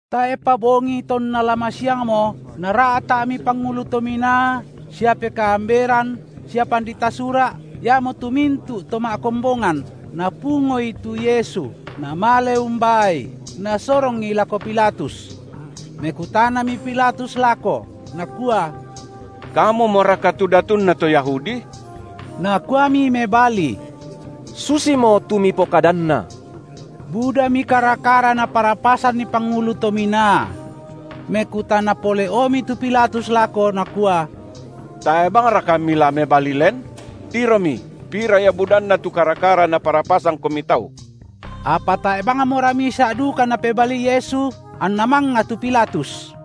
Tae’pa bongi tonna la masiangmo nara’ta’mi pangulu tominaa sia pekaamberan sia pandita Sura’, iamotu mintu’ to ma’kombongan, napungoI tu Yesu, namale umbaaI, nasorongI lako Pilatus. Mekutanami Pilatus lako, nakua: Kamumoraka tu datunna to Yahudi? Nakuami mebali: Susimo tu mipokadanna. Budami kara-kara naparapasanni pangulu to minaa. Mekutana pole’omi tu Pilatus lako, nakua: Tae’ bangraka Mila mebali len? Tiromi, pira ia budanna tu kara-kara naparapasangKomi tau! Apa tae’ bangmora misa’ duka Napebalii Yesu, anna mangnga tu Pilatus.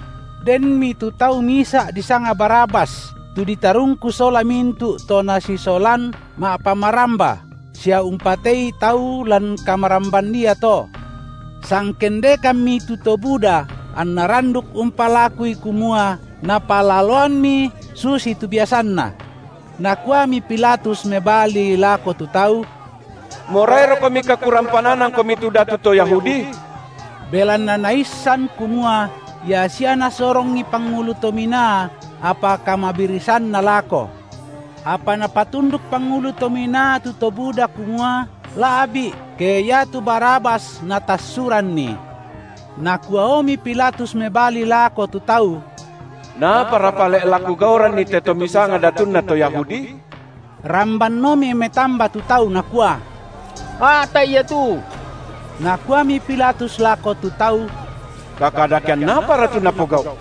Denmi tu tau misa’ disanga Barabas, tu ditarungku sola mintu’ tu to nasisolan ma’pamaramba, sia umpatei tau lan kamaramban iato. Sangkendekammi tu to buda anna randuk umpalakui kumua napalaloanni susitu biasanna. Nakuami Pilatus mebali lako tu tau: Morairokomika kurampananangkomi tu Datu to Yahudi? Belanna naissan kumua ia sia nasorongI pangulu to minaa, apa kamabirisanna lako. Apa napatunduk pangulu to minaa tu to buda kumua, la’bi’ ke ia tu Barabas natassuranni. Nakuaomi Pilatus mebali lako tu tau; Naapara pale’ la kugauranNi te To misanga Datunna to Yahudi? Rambanomi metamba tu tau nakua: A’ta’I Ia tu. Nakuami Pilatus lako tu tau: Kaka- dakean apara tu napogau’?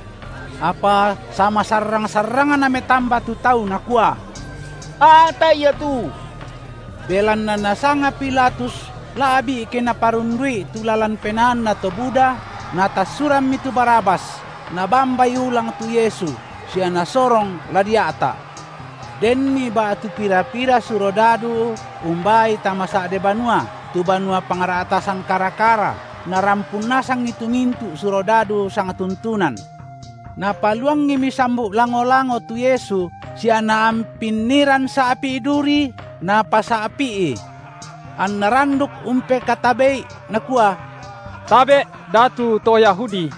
Apa sama- sarrang-sarrangna metamba tu tau nakua: A’ta’I Ia tu! Belanna nasanga Pilatus la’bi’ ke naparundu’i tu lalan penaanna to buda, natassurammi tu Barabas, nabambaI ulang tu Yesu sia nasorong la dia’ta’. Denmi ba’tu pira-pira surodadu umbaaI tama sa’de banua, tu banua pangra’tasan kara-kara, narampun nasangi tu mintu’ surodadu sang- tuntunan. Napaluangimi sambu’ lango-lango tu Yesu sia naampinniran sa’pi’ duri, napasa’pi’I. Anna randuk umpekatabe’I, nakua: Tabe’, Datu to Yahudi!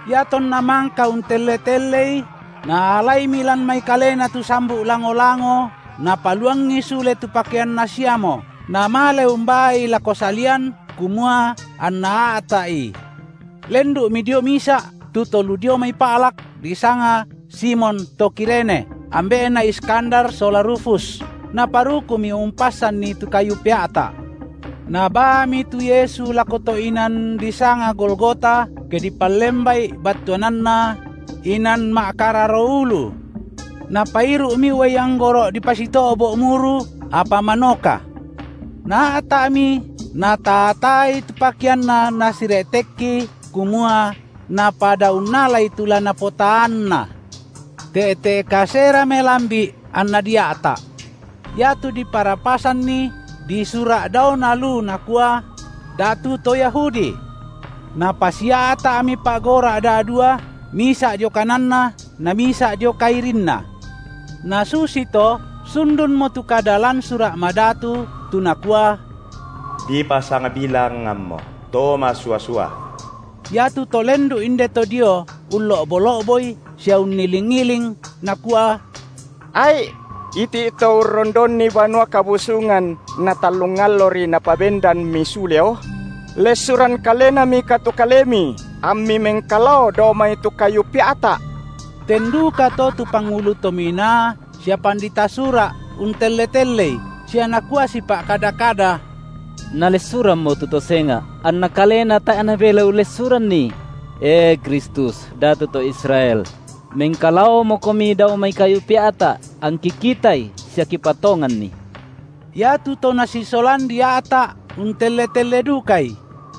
Iatonna mangka untelle-telleI, naalaimi lan mai Kalena tu sambu’ lango-lango napaluangi sule tu pakeanNa siamo, namale umbaaI lako salian, kumua anna a’ta’I. Lendu’mi dio misa’ tu to lu dio mai pa’lak, disanga Simon to Kirene, ambe’na Iskandar sola Rufus, naparukumi umpassanni tu kayu pea’ta’. Nabaami tu Yesu lako to’ inan disanga Golgota, ke dipallemba’i battuananna: Inan ma’kararo ulu. Napairu’mi uai anggoro’ dipasito’bo’ muru, apa manoka. Naa’ta’mi, nataa-taai tu pakeanNa nasire’tekki kumua napada unnalai tu la napotaanna. Te’te’ kasera melambi’ anna dia’ta’. Iatu diparapasanni disura’ daona lu nakua: Datu to Yahudi. Napasia’ta’mi pa’gora’ da’dua, misa’ dio kananNa na misa’ dio kairinNa. Nasusi to, sundunmo tu kada lan Sura’ Madatu, tu nakua: Dipasangbilangammo to masua-sua. Iatu to lendu’ inde to dio ullo’bo-lo’boI sia unniling-iling, nakua: Ai’! iti’ To urrondonni Banua Kabusungan natallung allori Napabendanmi suleo! Lessuran kalenamika tu Kalemi, amMi mengkalao dao mai tu kayu pea’ta’! Ten dukato tu pangulu to minaa sia pandita Sura’ untelle-telleI, sia nakua sipa’kada-kada: Nalessurammo tu to senga’, anna Kalena tae’ Nabelai ullessuranNi! E Kristus, Datu to Israel! mengkalaomoKomi dao mai kayu pea’ta’, angki kitai sia kipatonganni. Iatu to Nasisolan dia’ta’ untelle-telle dukaI.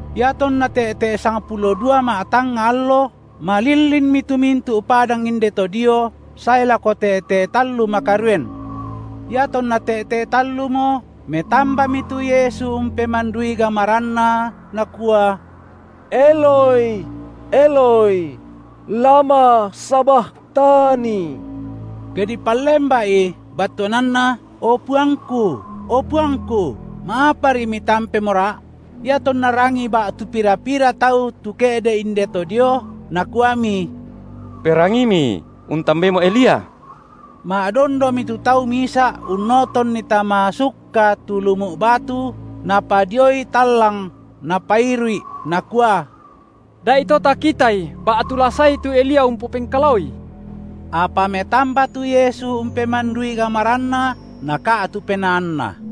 Iatonna te’te’ sangpulo dua ma’tangnga allo, malillinmi tu mintu’ padang indeto dio sae lako te’te’ tallu makaroen. Iatonna te’te’ tallumo, metambami tu Yesu umpemandui gamaranNa, Nakua: Eloi, Eloi, lama sabakhtani?, ke dipallemba’i battuananna: O PuangKu, o PuangKu ma’apari MitampemoRa’? Iatonna rangii ba’tu pira-pira tau tu ke’de’ indeto dio, nakuami: Perangiimi, untambaimo Elia! Ma’dondomi tu tau misa’ unnotonni tama sukka tu lumu’ batu, napadioi tallang napairu’I, nakua: Da’ito takitai ba’tu la saei tu Elia umpopengkalaoI. Apa metamba tu Yesu umpemandui gamaranNa, naka’tu penaanNa.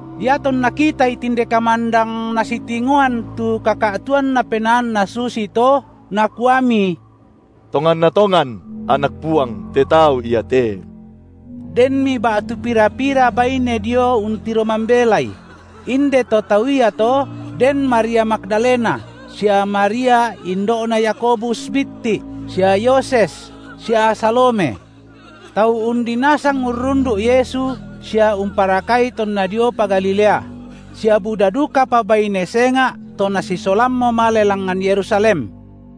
Iatonna kitai tinde kamandang Nasitingoan tu kaka’tuanna penaanNa susito, nakuami: Tonganna tongan Anak Puang te tau iate! Denmi ba’tu pira-pira baine dio untiro mambelai; indeto tau iato, den Maria Magdalena sia Maria indo’na Yakobus Bitti’ sia Yoses sia Salome. Tau undi nasang urrundu’ Yesu sia umparakai tonna diopa Galilea; sia buda dukapa baine senga’ to Nasisolammo male langngan Yerusalem.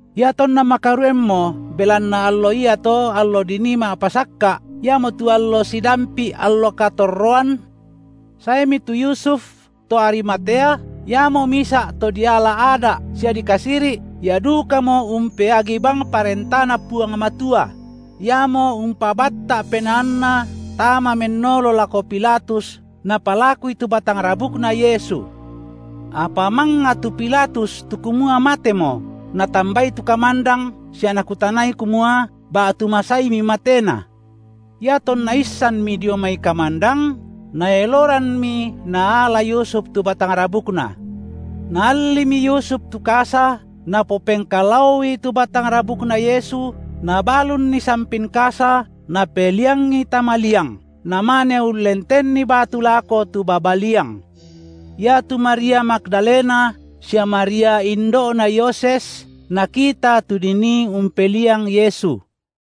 Iatonna makaroenmo belanna allo iato allo dinii Ma’pasakka’, iamotu allo sidampi’ allo katorroan, saemi tu Yusuf to Arimatea, iamo misa’ to diala Ada’ sia dikasiri’, ia dukamo umpeagi bang ParentaNa Puang Matua; iamo umpabatta’ penaanna tama mennolo lako Pilatus napalakui tu batang rabukna Yesu. Apa mangnga tu Pilatus tu kumua matemo, natambai tu kamandang sia nakutanai kumua, ba’tu masaimi mateNa. Iatonna issanmi dio mai kamandang, naeloranmi naala Yusuf tu batang rabukNa. Naallimi Yusuf tu kasa, napopeng-kalaoi tu batang rabukna Yesu, na balunni sampin kasa napeliangi tama liang; namane ullentenni batu lako tu baba liang. Iatu Maria Magdalena sia Maria indo’na Yoses, nakita tu dinii umpeliang Yesu.